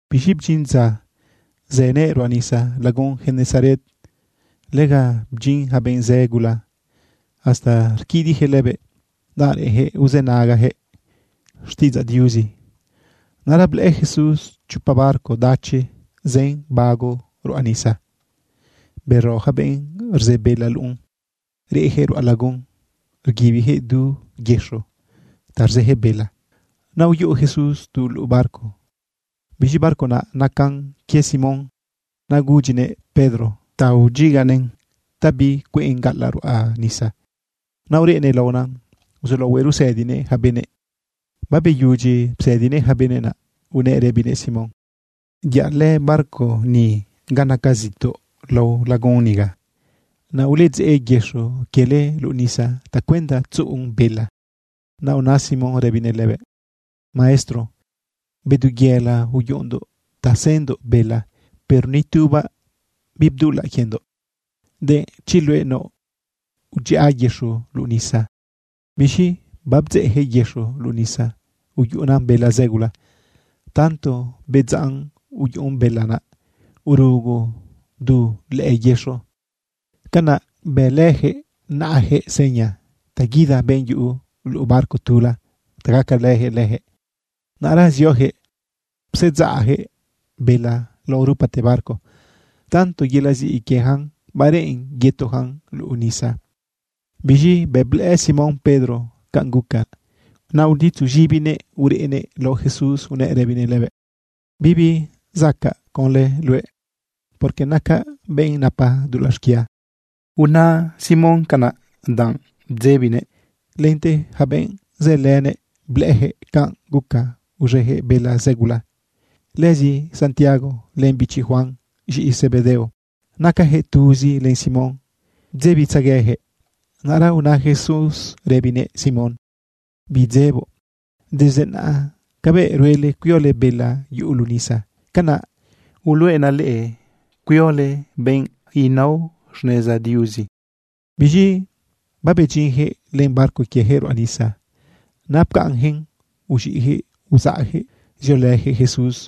Biz̃i bdyin dza uzëguëꞌ ruꞌa nisa lagun Genesaret. Lega bdyin yaca benꞌ zë gula hasta rquidiꞌyaquëꞌ lëbëꞌ danꞌ reꞌenyaquëꞌ uzënagayaquëꞌ xtiꞌidzaꞌ Diuzi. Naꞌra blëꞌë Jesús chopa barco dachi zën bago ruꞌa nisa. Bero yaca benꞌ rze bela luꞌun, reꞌyaquëꞌ ruꞌa lagun rguibiyaquëꞌ duyëxo ta rzeyaquëꞌ bela. Naꞌ uyuꞌu Jesús tu luꞌu barco. Biz̃i barco naꞌ nacan quie Simón. Naꞌ gudyinëꞌ Pedro ta udyiganëꞌn ta bicueꞌn gaꞌalaꞌ ruꞌa nisa. Naꞌ ureꞌnëꞌ laona uzulaohuëꞌ rusëdinëꞌ yaca benëꞌ. Babeyudyi psëdinëꞌ yaca benëꞌ, naꞌ unëꞌ rëbinëꞌ Simón: ―Yaꞌlë barco ni ga naca zituꞌ lao lagun niga. Naꞌ uledzeꞌ yëxo quiele luꞌu nisa tacuenda tzuꞌun bela. Naꞌ una Simón rëbinëꞌ lëbëꞌ: ―Maestro, bedu yela uyuꞌundoꞌ ta sendoꞌ bela, pero ni tubaꞌ bibdulaꞌ quiendoꞌ. Denꞌ chi luëꞌ naoꞌ, udziꞌa yëxo luꞌu nisa. Biz̃i babdzeꞌyaquëꞌ yëxo luꞌu nisa uyuꞌuna bela zë gula. Tanto bedzaꞌn uyuꞌun bela naꞌ, urugu du lëꞌë yëxo. Canaꞌ bëlëyaquëꞌ naꞌayaquëꞌ seña ta guida benꞌ yuꞌu luꞌu barco tula ta gacalëyaquëꞌ leyaquëꞌ. Naꞌra zioyaquëꞌ psedzaꞌyaquëꞌ bela lao rupate barco. Tanto yelaꞌ ziꞌi quieyacan, bareꞌen yetuyacan luꞌu nisa. Biz̃i bëꞌ blëꞌë Simón Pedro canꞌ guca, naꞌ uditzu z̃ibinëꞌ ureꞌnëꞌ lao Jesús unëꞌ rëbinëꞌ lëbëꞌ: ―Bibi zacaꞌ conlë luëꞌ, porque nacaꞌ benꞌ napa dulaꞌ xquia. Una Simón canꞌ, danꞌ bdzebinëꞌ lente yaca benꞌ zëlënëꞌ. Blëꞌëyaquëꞌ canꞌ guca uz̃eyaquëꞌ bela zë gula. Lëzi Santiago len bichibiꞌ Juan, z̃iꞌi Zebedeo, nacayaquëꞌ tuzi len Simón, bdzebitzegueyaquëꞌ. Naꞌra una Jesús rëbinëꞌ Simón: ―Bidzeboꞌ, desde naꞌa cabëꞌ ruele cuiole bela yuꞌu luꞌu nisa, canaꞌ uluꞌenaꞌ leꞌe cuiole benꞌ nao xneza Diuzi. Biz̃i babedyinyaquëꞌ len barco quieyaquëꞌ ruꞌa nisa, naꞌ pcaꞌnyaquëꞌn uz̃iꞌyaquëꞌ uzaꞌyaquëꞌ ziolëyaquëꞌ Jesús.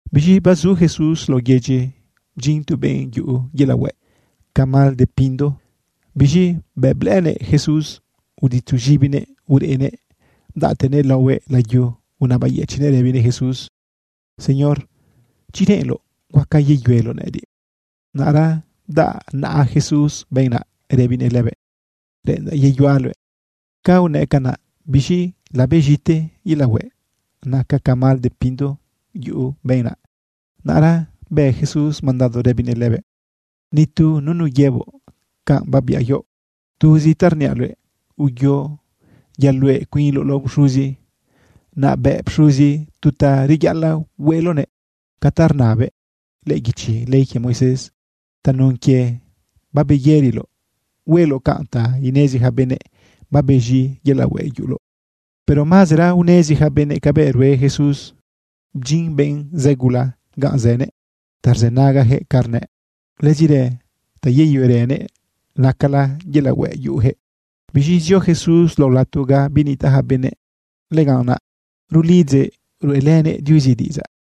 Biz̃i bazu Jesús lao yedyi, bdyin tu benꞌ yuꞌu yelaꞌ hueꞌ ca mal de pindo. Biz̃i bëꞌ blëꞌënëꞌ Jesús, uditzu z̃ibinëꞌ ureꞌnëꞌ bdaꞌte laohuëꞌ layu unabayëchiꞌnëꞌ rëbinëꞌ Jesús: ―Señor, chi reꞌenloꞌ huaca yeyueloꞌ nëꞌëdiꞌ. Naꞌra bdaꞌ naꞌa Jesús benꞌ naꞌ rëbinëꞌ lëbëꞌ: ―Reꞌendaꞌ yeyuaꞌ luëꞌ. Ca unëꞌ canaꞌ, biz̃i labez̃ite yelaꞌ hueꞌ naca ca mal de pindo yuꞌu benꞌ naꞌ. Naꞌra bë Jesús mandado rëbinëꞌ lëbëꞌ: ―Ni tu nunu yëboꞌ canꞌ babiaꞌ quioꞌ. Tuzi ta rniaꞌ luëꞌ, uyo yaluꞌe cuinloꞌ lao pxuzi. Naꞌ bëꞌ pxuzi tu ta reyaꞌalaꞌ hueꞌloꞌnëꞌ ca ta rnabëꞌ lëꞌë guichi ley quie Moisés tanun quie babeyëriloꞌ. Hueloꞌ canꞌ ta inezi yaca benëꞌ babez̃i yelaꞌ hueꞌ uyuꞌuloꞌ. Pero mazera unezi yaca benëꞌ cabëꞌ rue Jesús. Bdyin benꞌ zë gula ganꞌ zënëꞌ ta rzënagayaquëꞌ ca rnëꞌ, lëzirë ta yeyuerënëꞌ nacala yelaꞌ hueꞌ yuꞌuyaquëꞌ. Biz̃i zio Jesús lao lato ga binitaꞌ yaca benëꞌ. Lëganꞌ naꞌ rulidzëꞌ ruꞌelënëꞌ Diuzi diꞌidzaꞌ.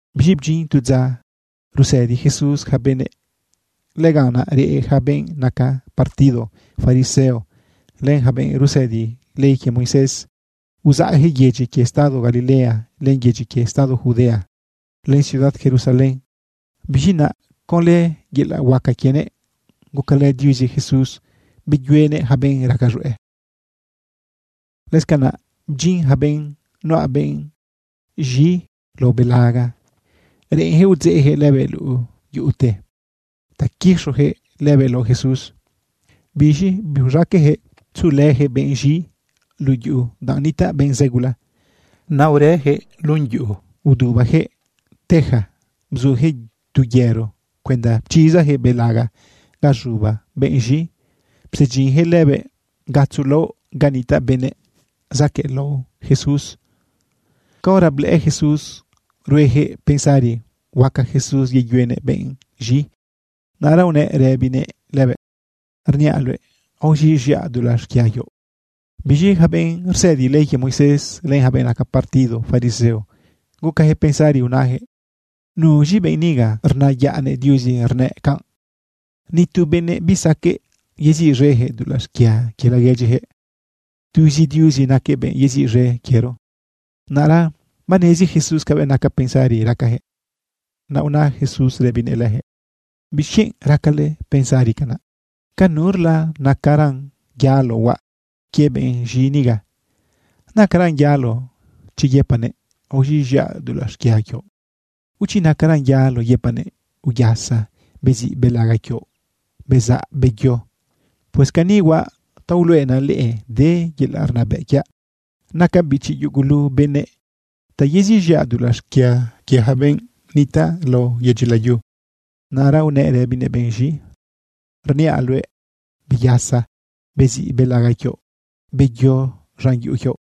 Biz̃i bdyin tu dza rusëdi Jesús yaca benëꞌ. Lëganꞌ naꞌ reꞌ yaca benꞌ naca partido fariseo len yaca benꞌ rsëdi ley quie Moisés. Uzaꞌyaquëꞌ yedyi quie estado Galilea len yedyi quie estado Judea, len ciudad Jerusalén. Biz̃i naꞌa, conlë yelaꞌ huaca quienëꞌ, gucalë Diuzi Jesús, beyuenëꞌ yaca benꞌ raca z̃hueꞌ. Lëscanaꞌ bdyin yaca benꞌ nuꞌa benꞌ z̃i lao belaga. Reꞌenyaquëꞌ udzeꞌyaquëꞌ lëbëꞌ luꞌu yuꞌute ta quixoyaquëꞌ lëbëꞌ lao Jesús. Biz̃i biuz̃aqueꞌyaquëꞌ tzuꞌulëyaquëꞌ benꞌ z̃i luꞌu yuꞌu danꞌ nitaꞌ benꞌ zë gula. Naꞌ urëyaquëꞌ lun yuꞌu udubayaquëꞌ teja, bzuyaquëꞌ tu yero cuenda pchizayaquëꞌ belaga ga z̃uba benꞌ z̃i, psedyinyaquëꞌ lëbëꞌ gatzo laoꞌ ga nitaꞌ benëꞌ zaquëꞌlao lao Jesús. Caora blëꞌë Jesús rueyaquëꞌ pensari huaca Jesús yeyuenëꞌ benꞌ z̃i, naꞌra unëꞌ rëbinëꞌ lëbëꞌ: ―Rniaꞌ luëꞌ, aoz̃iꞌz̃iaꞌ dulaꞌ xquia quioꞌ. Biz̃i yaca benꞌ rsëdi ley quie Moisés, len yaca benꞌ naca partido fariseo, gucayaquëꞌ pensari unayaquëꞌ: “¿Nuz̃i benꞌ niga rnayaꞌnëꞌ Diuzi rnëꞌ canꞌ? Ni tu benëꞌ bisaqueꞌ yeziꞌz̃eyaquëꞌ dulaꞌ xquia quie laguedyiyaquëꞌ. Tuzi Diuzi naquëꞌ benꞌ yeziꞌz̃e quiero.” Naꞌra banezi Jesús cabëꞌ naca pensari racayaquëꞌ. Naꞌ una Jesús rëbinëꞌ leyaquëꞌ: ―¿Bixquienꞌ racale pensari canaꞌ? ¿Ca nurlan nacaran yalo huaꞌ quie benꞌ z̃i niga? ¿Nacaran yalo chi yëpaꞌnëꞌ: “Aoz̃iꞌz̃iaꞌ dulaꞌ xquia quioꞌ”, o chi nacaran yalo yëpaꞌnëꞌ: “Uyasa, beziꞌ belaga quioꞌ, bezaꞌ, beyo”? Pues cani huaꞌ ta uluꞌenaꞌ leꞌe de yelaꞌ rnabëꞌ quiaꞌ, nacaꞌ bichi yugulu benëꞌ, ta yeziꞌz̃iaꞌ dulaꞌ xquia quie yaca benꞌ nitaꞌ lao yedyi layu. Naꞌra unëꞌ rëbinëꞌ benꞌ z̃i: ―Rniaꞌ luëꞌ, beyasa, beziꞌ belaga quioꞌ, beyo z̃an yuꞌu quioꞌ.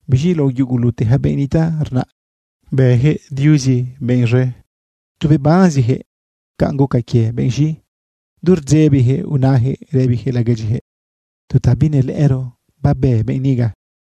Biz̃i lao yugulute yaca benꞌ nitaꞌ rnaꞌ, bëyaquëꞌ Diuzi benꞌ z̃e. Tu bebanziyaquëꞌ canꞌ guca quie benꞌ z̃i. Du rdzebiyaquëꞌ unayaquëꞌ rëbiyaquëꞌ laguedyiyaquëꞌ: ―Tu ta binelëꞌëro babë benꞌ niga.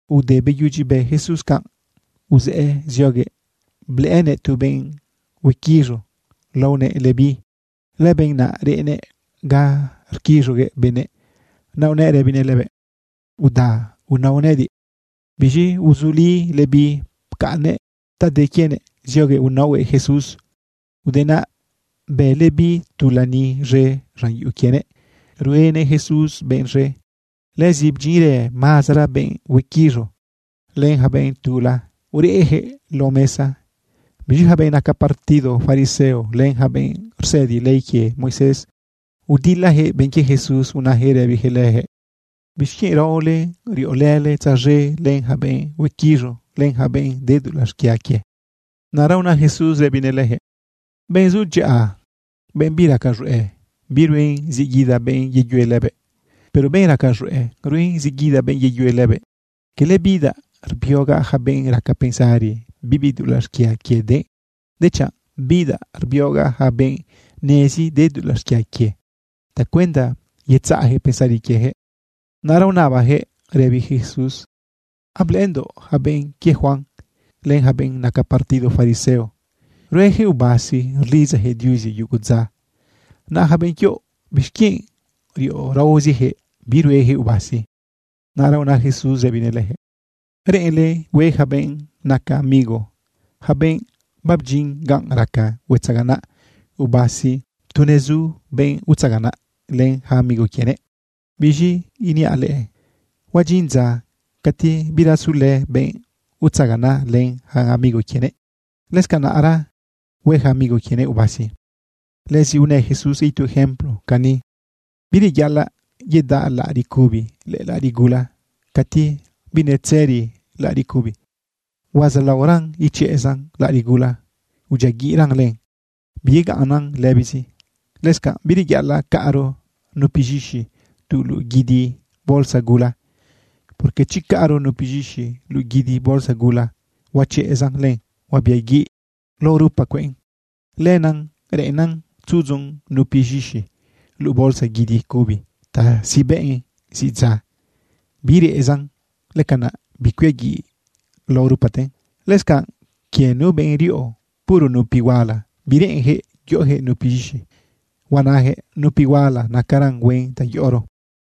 Ude beyudyi bë Jesús canꞌ, uzëꞌë zioguëꞌ blëꞌënëꞌ tu benꞌ huequiz̃u laonëꞌ Leví. Lëbenꞌ naꞌ reꞌnëꞌ ga rquiz̃uguëꞌ benëꞌ. Naꞌ unëꞌ rëbinëꞌ lëbëꞌ: ―Uda, unao nëꞌëdiꞌ. Biz̃i uzuli Leví pcaꞌnnëꞌ ta de quienëꞌ zioguëꞌ naohuëꞌ Jesús. Ude naꞌ, bë Leví tu lani z̃e z̃an yuꞌu quienëꞌ ruenëꞌ Jesús benꞌ z̃e. Lëzi bdyinrë mazara benꞌ huequiz̃u, len yaca benꞌ tula ureꞌyaquëꞌ lao mesa. Biz̃i yaca benꞌ naca partido fariseo, len yaca benꞌ rsëdi ley quie Moisés udilayaquëꞌ benꞌ quie Jesús unayaquëꞌ rëbiyaquëꞌ leyaquëꞌ: ―¿Bixquienꞌ raole riꞌolële tzaz̃e len yaca benꞌ huequiz̃u, len yaca benꞌ de dulaꞌ xquia quie? Naꞌra una Jesús rëbinëꞌ leyaquëꞌ: ―Benꞌ zu dyaꞌa, benꞌ biraca z̃hueꞌ, biruen zi guida benꞌ yeyue lëbëꞌ. Pero benꞌ raca z̃hueꞌ, ruen zi guida benꞌ yeyue lëbëꞌ. Cala bidaꞌ rbiogaꞌ yaca benꞌ raca pensari bibi dulaꞌ xquia quie de, dechanꞌ bidaꞌ rbiogaꞌ yaca benꞌ nezi de dulaꞌ xquia quie tacuenda yetzaꞌyaquëꞌ pensari quieyaquëꞌ. Naꞌra unabayaquëꞌ rëbiyaquëꞌ Jesús: ―Ablëꞌëndoꞌ yaca benꞌ quie Juan len yaca benꞌ naca partido fariseo, rueyaquëꞌ ubasi rlidzayaquëꞌ Diuzi yugu dza, naꞌ yaca benꞌ quioꞌ, ¿bixquienꞌ riꞌo raoziyaquëꞌ, biruejëꞌ ubasi? Naꞌra una Jesús rëbinëꞌ leyaquëꞌ: ―¿Reꞌenle hue yaca benꞌ naca amigo, yaca benꞌ babdyin ganꞌ raca huetzaganaꞌ ubasi tu nezu benꞌ utzaganaꞌ len yaca amigo quienëꞌ? Biz̃i rniaꞌ leꞌe, huadyin dza cati bira zulë benꞌ utzaganaꞌ len yaca amigo quienëꞌ. Lëscanaꞌra hue yaca amigo quienëꞌ ubasi. Lëzi unë Jesús itu ejemplo cani: ―Bireyaꞌalaꞌ yedaꞌ laꞌariꞌ cubi lëꞌë laꞌariꞌ gula cati binetzëri laꞌariꞌ cubi. Huazaꞌlaoran ichezan laꞌariꞌ gula, udyiaguiꞌran len, biyegaꞌnnan lëbizi. Lëscanꞌ bireyaꞌalaꞌ caꞌro nupi z̃ixi tu luꞌu guidi bolsa gula, porque chi caꞌro nupi z̃ixi luꞌu guidi bolsa gula, huachezan len huabiaguiꞌ lao rupa cueꞌn. Lenaꞌ reꞌennan tzudzu nupi z̃ixi luꞌu bolsa guidi cubi ta sibeꞌn zi dza, birezan. Lëcanaꞌ bicuiaguiꞌ lao rupaten. Lëscanꞌ quie nu benꞌ riꞌo puro nupi huala bireꞌenyaquëꞌ yoꞌoyaquëꞌ nupi z̃ixi. Huanayaquëꞌ: “Nupi huala nacaran huen ta yoꞌoro.”